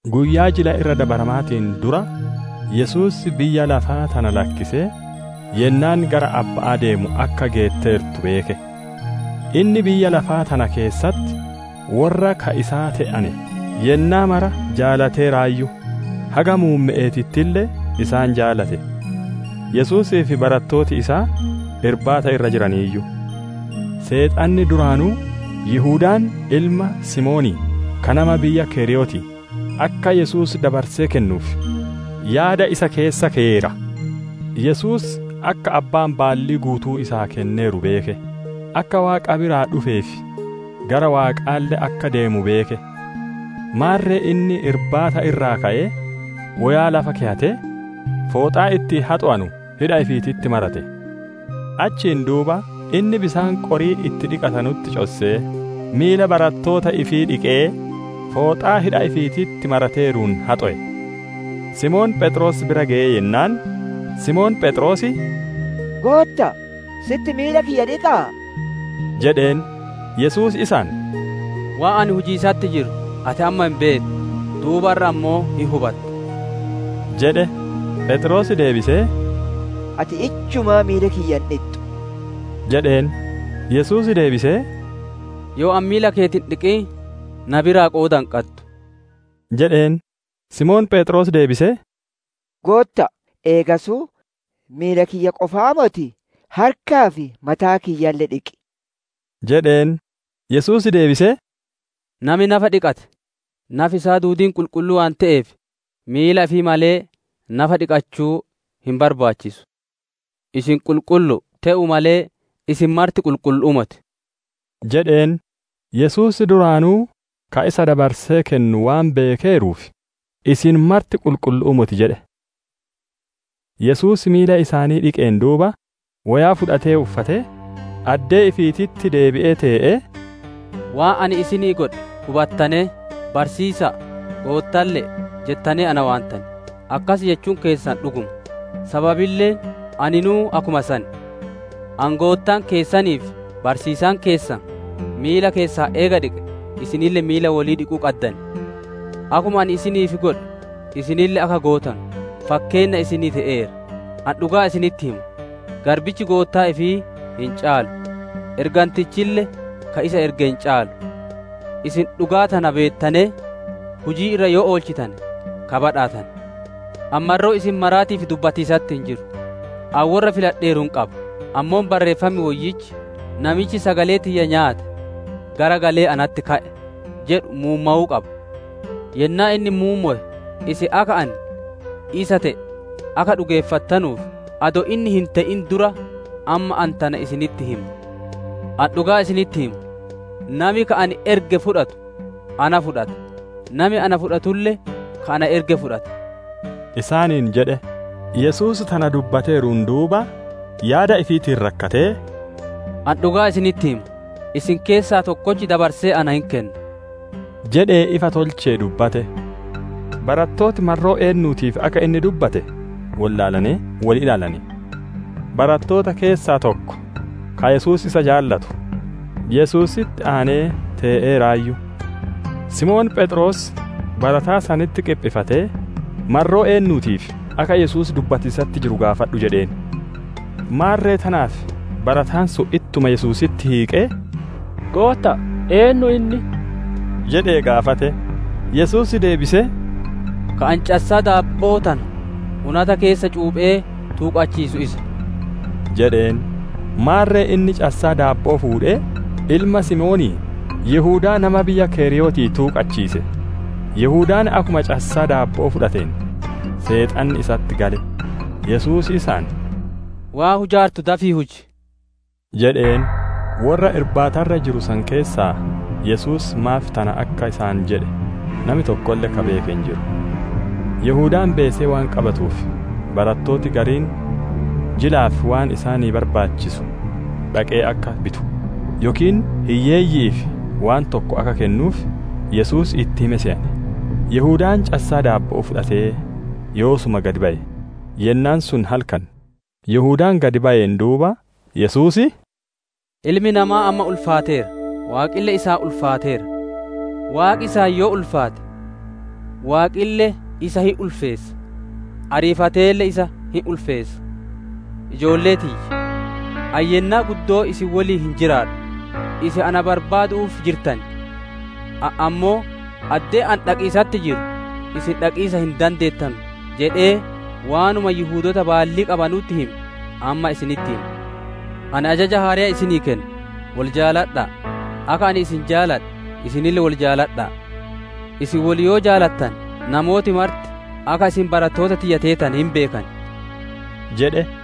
Guyyaa Jila Irra Dabaramaatiin dura, Yesuus biyya lafaa tana lakkisee yennaan gara Abba'aa deemu akka geetteertu beeke. Inni biyya lafaa tana keessatti worra ka isaa te'ane yennaa mara jaalateeraayyu; haga muumme'eetittille isaan jaalate. Yesuusii fi barattooti isaa irbaata irra jiraniiyyu. Seexanni duraanuu Yihudaan ilma Simoonii ka nama biyya Keriyootii, akka Yesuus dabarsee kennuuf, yaada isa keessa keyeera. Yesuus akka Abbaan baallii guutuu isaa kenneeru beeke; akka Waaqa biraa dhufee fi gara Waaqaalle akka deemu beeke. Maarre inni irbaata irraa ka'ee, woyaa lafa keyatee, fooxaa ittiin haxowanu hidha ifiititti marate. Achiin duuba inni bisaan qorii itti dhiqatanutti cossee, miila barattoota ifii dhiqee fooxaa hidha ifiititti marateeruun haxowe. Simoon Pheexroos bira geyee jennaan, Simoon Pheexroos, «Gootta'a, sitti miila kiyya dhiqaa?» jedheen. Yesuus isaan, «Waan ani hujiisatti jiru ati amma hin beettu, duubarra ammoo hin hubatta» jedhe. Pheexroos deebisee, «Ati ijjumaa miila kiyya hin dhixxu!» jedheen. Yesuus deebisee, «Yoo ani miila keeti hin dhiqin, na biraa qooda hin qaddu» jedheen. Simoon Pheexroos deebisee, «Gootta'a, eegasuu, miila kiyya qofaa motii, harkaa fi mataa kiyyalle dhiqi!» jedheen. Yesuus deebisee, «Nami nafa dhiqate, nafi isaa duudiin qulqulluu waan te'eef, miila ifii malee, nafa dhiqachuu hin barbaachisu. Isin qulqullu'u; te'uu malee, isin marti qulqullu'uu moti» jedheen. Yesuus duraanuu ka isa dabarsee kennu waan beekeeruuf, «Isin marti qulqullu'uu moti» jedhe. Yesuus miila isaanii dhiqeen duuba, woyaa fudhatee uffatee, addee ifiititti deebi'ee tee'ee, «‹Waan ani isinii godhe hubattanee?› jedhee gaafate. ‹Barsiisa'a, Goottaalle› jettanee na waantan; akkas jechuun keessan dhuguma; sababilleen aninuu akkuma san. Ani, Goottaan keessanii fi barsiisaan keessan, miila keessan eega dhiqee, isinille miila wolii dhiquu qaddan. Akkuma ani isiniif godhe isinille akka gootanu, fakkeenna isinii te'eera. Ani dhugaa isinitti hima: Garbichi goottaa ifii hin caalu, ergantichille ka isa erge hin caalu. Isin dhugaa tana beettanee, hujii irra yoo oolchitane ka badhaatane. «Ani marroo isin maraatiif dubbatiisatti hin jiru; ani worra filadheeru hin beeka; ammoo Barreeffam Woyyichi, ‹Namichi sagalee tiyya nyaate garagalee natti ka'e!› jedhu muummowuu qaba. Yennaa inni muummowe, isin akka Ani Isa te'e akka dhugeeffattanuuf, adoo inni hin te'in dura amma ani tana isinitti hima. Ani dhugaa isinitti hima: Nami ka ani erge fudhatu na fudhata; nami na fudhatulle ka na erge fudhata» isaaniin jedhe. Yesuus tana dubbateeruun duuba, yaada ifiitiin rakkatee, «Ani dhugaa isinitti hima: Isin keessaa tokkochi dabarsee na hin kenna» jedhee ifa tolchee dubbate. Barattooti marroo eennuutiif akka inni dubbate wollaalanee, wol ilaalane. Barattoota keessaa tokko, ka Yesuus isa jaalatu, Yesuusitti aanee tee'eeraayyu. Simoon Pheexroos, barataa sanitti qiphifatee, «Marroo eennuutiif akka Yesuus dubbatiisatti jiru gaafadhu» jedheen. Maarre tanaaf barataan sun ittuma Yesuusitti hiiqee, «Gootta'a, eennu inni?» jedhee gaafate. Yesuus deebisee, «Ka ani cassaa daabbo'oo tana unata keessa cuuphee tuuqachiisu isa» jedheen; maarre inni cassaa daabbo'oo fuudhee, ilma Simoonii, Yihudaa nama biyya keriyootii tuuqachiise. Yihudaan akkuma cassaa daabbo'oo fudhateen, Seexanni isatti gale; Yesuus isaan, «Waan hujaartu dafii huji!» jedheen. Worra irbaata irra jiru san keessaa Yesuus maaf tana akka isaan jedhe nami tokkolle ka beeke hin jiru. Yihudaan beesee waan qabatuuf, barattooti gariin jilaaf waan isaanii barbaachisu dhaqee akka bitu, yookiin hiyyeeyyi'iif waan tokko akka kennuuf, Yesuus itti hime seyane. Yihudaan cassaa daabbo'oo fudhatee yoosuma gad baye. Yennaan sun halkan. Yihudaan gad bayeen duuba, Yesuus, «Ilmi Namaa amma ulfaateera; Waaqille isaan ulfaateera. Waaqi isaan yoo ulfaate, Waaqille isa hin ulfeessa; ariifateelle isa hin ulfeessa. Ijoollee tiyya, ani yennaa guddoo isin woliin hin jiraadhu. Isin na barbaadu'uuf jirtan; ani ammoo, ‹Addee ani dhaqiisatti jiru isin dhaqiisa hin dandeettanu› jedhee waanuma Yihudoota baallii qabanutti hime amma isinitti hima. Ani ajaja haareya isinii kenna: Wol jaaladha'a. Akka ani isin jaaladhe, isinille wol jaaladha'a. Isin wol yoo jaalattane, namooti marti akka isin barattoota tiyya teetane hin beekan» jedhe.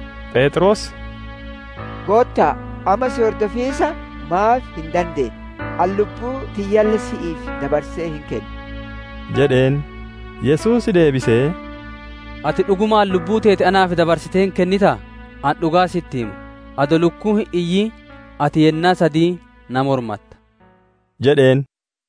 Pheexroos, «Gootta'a, amma si hordofiisa maaf hin dandeenne? Ani lubbuu tiyyalle si'iif dabarsee hin kenna» jedheen. Yesuus deebisee, «Ati dhugumaan lubbuu teeti naaf dabarsitee hin kennitaa? Ani dhugaa sitti hima: Adoo lukkuun hin iyyin ati yennaa sadiin na mormatta» jedheen.